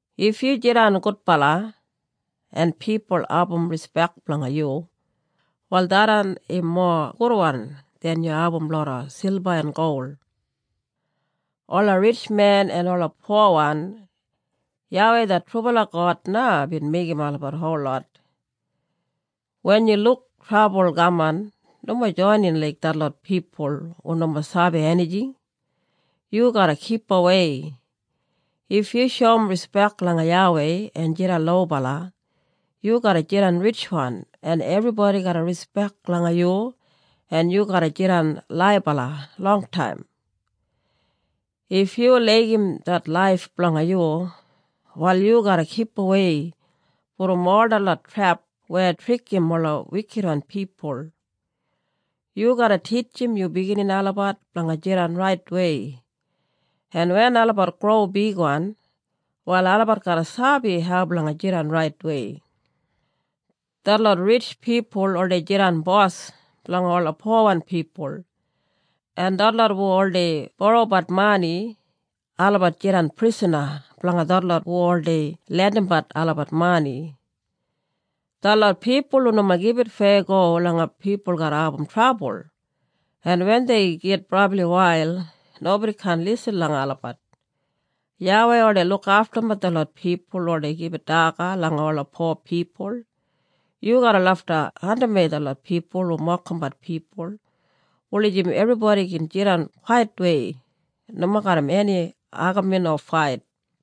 If yu jidan gudbala en pipul abum rispek blanga yu wal tharran im mowa gudwan den yu abum loda silba en gol. Ola ritjmen en ola powan, YAWEI det trubala God na bin meigim olabat holot. Wen yu luk trabul kaman nomo joinin laik detlot pipul hu nomo sabi enijing. Yu garra kipawei. If yu shoum rispek langa YAWEI en jidan lobala yu garra jidan ritjwan en ebribodi garra rispek langa yu en yu garra jidan laibala longtaim. If yu laigim det laif blanga yu, wal yu garra kipawei brom ol detlot trep weya trikim ola wikitwan pipul. Yu garra titjim yu biginini olabat blanga jidan raitwei en wen olabat gro bigwan, wal olabat garra sabi hau blanga jidan raitwei. Detlot ritj pipul oldei jidan bos blanga ola powan pipul, en detlot hu oldei borobat mani, olabat jidan prisana blanga detlot hu oldei lendimbat olabat mani. Detlot pipul hu nomo gibit feyago langa pipul garra abum trabul, en wen dei git brabli wail nobodi kaan lisin langa olabat. YAWEI oldei lukaftumbat detlot pipul hu oldei gibit daga langa ola po pipul. Yu garra lafta andimwei detlot pipul hu mokimbat pipul, wulijim ebribodi gin jidan kwaitwei, nomo garram eni agamin o fait.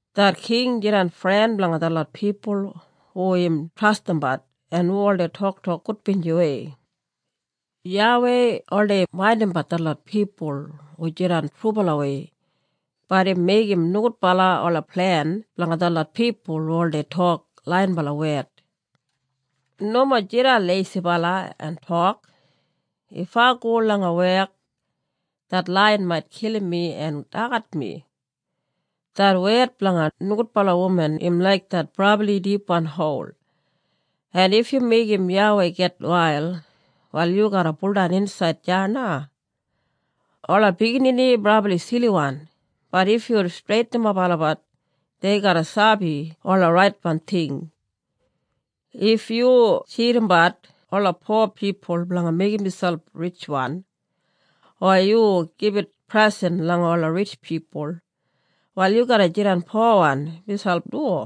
Det king jidan fren blanga detlot pipul hu im trastimbat en hu oldei toktok gudbinjiwei. YAWEI oldei maindimbat detlot pipul hu jidan trubalawei, bat im meigim nogudbala ola plen blanga detlot pipul hu oldei tok laiyinbala wed. Nomo jidan leisibala en tok, “If ai go langa wek det laiyan mait kilim mi en dagat mi.” Det wed blanga nogudbala wuman im laik det brabli dipwan hol, en if yu meigim YAWEI gitwail, wal yu garra buldan insaid deya na. Ola biginini brabli siliwan, bat if yu streitinimap olabat dei garra sabi ola raitwan ting. If yu tjidimbat ola po pipul blanga meigim miselp ritjwan, o yu gibit presen langa ola ritj pipul, wal yu garra jidan powan miselp du.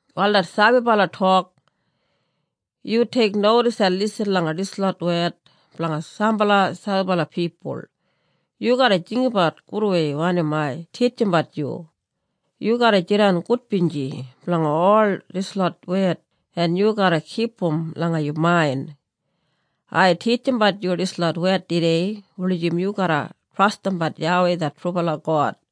Wal det sabibala tok, “Yu teiknodis en lisin langa dislot wed blanga sambala sabibala pipul. Yu garra jinggabat gudwei wanim ai titjimbat yu. Yu garra jidan gudbinji blanga ol dislot wed en yu garra kipum langa yu main. Ai titjimbat yu dislot wed tudei, wulijim yu garra trastimbat YAWEI det trubala God.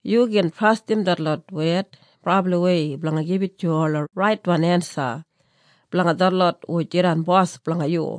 Yu gin trastim detlot wed brabliwei blanga gibit yu ola raitwan ensa blanga detlot hu jidan bos blanga yu.”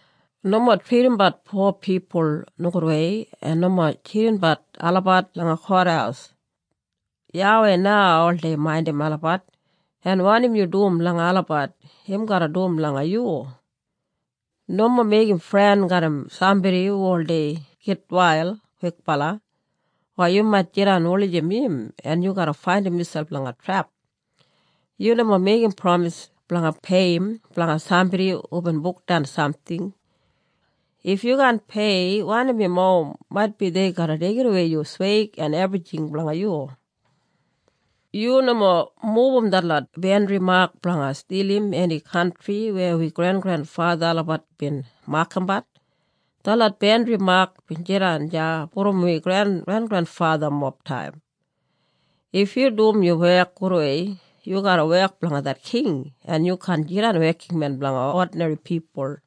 Nomo tridimbat po pipul nogudwei en nomo tjidimbat olabat langa kothaus. YAWEI na oldei maindim olabat, en wanim yu dum langa olabat im garra dum langa yu. Nomo meigim fren garram sambodi hu oldei gitwail kwikbala, o yu mait jidan wulijim im en yu garra faindim miselp langa trep. Yu nomo meigim pramis blanga peiyim blanga sambodi hubin bukdan samting. If yu kaan pei wanim im owim maitbi dei garra deigimwei yu sweig en ebrijing blanga yu. Yu nomo mubum detlot bandri mak blanga stilim eni kantri weya wi grengrenfatha olabat bin makambat. Detlot bandri mak bin jidan deya brom wi grengrenfathamob taim. If yu dum yu wek gudwei, yu garra wek blanga det king en yu kaan jidan wekinmen blanga odinri pipul.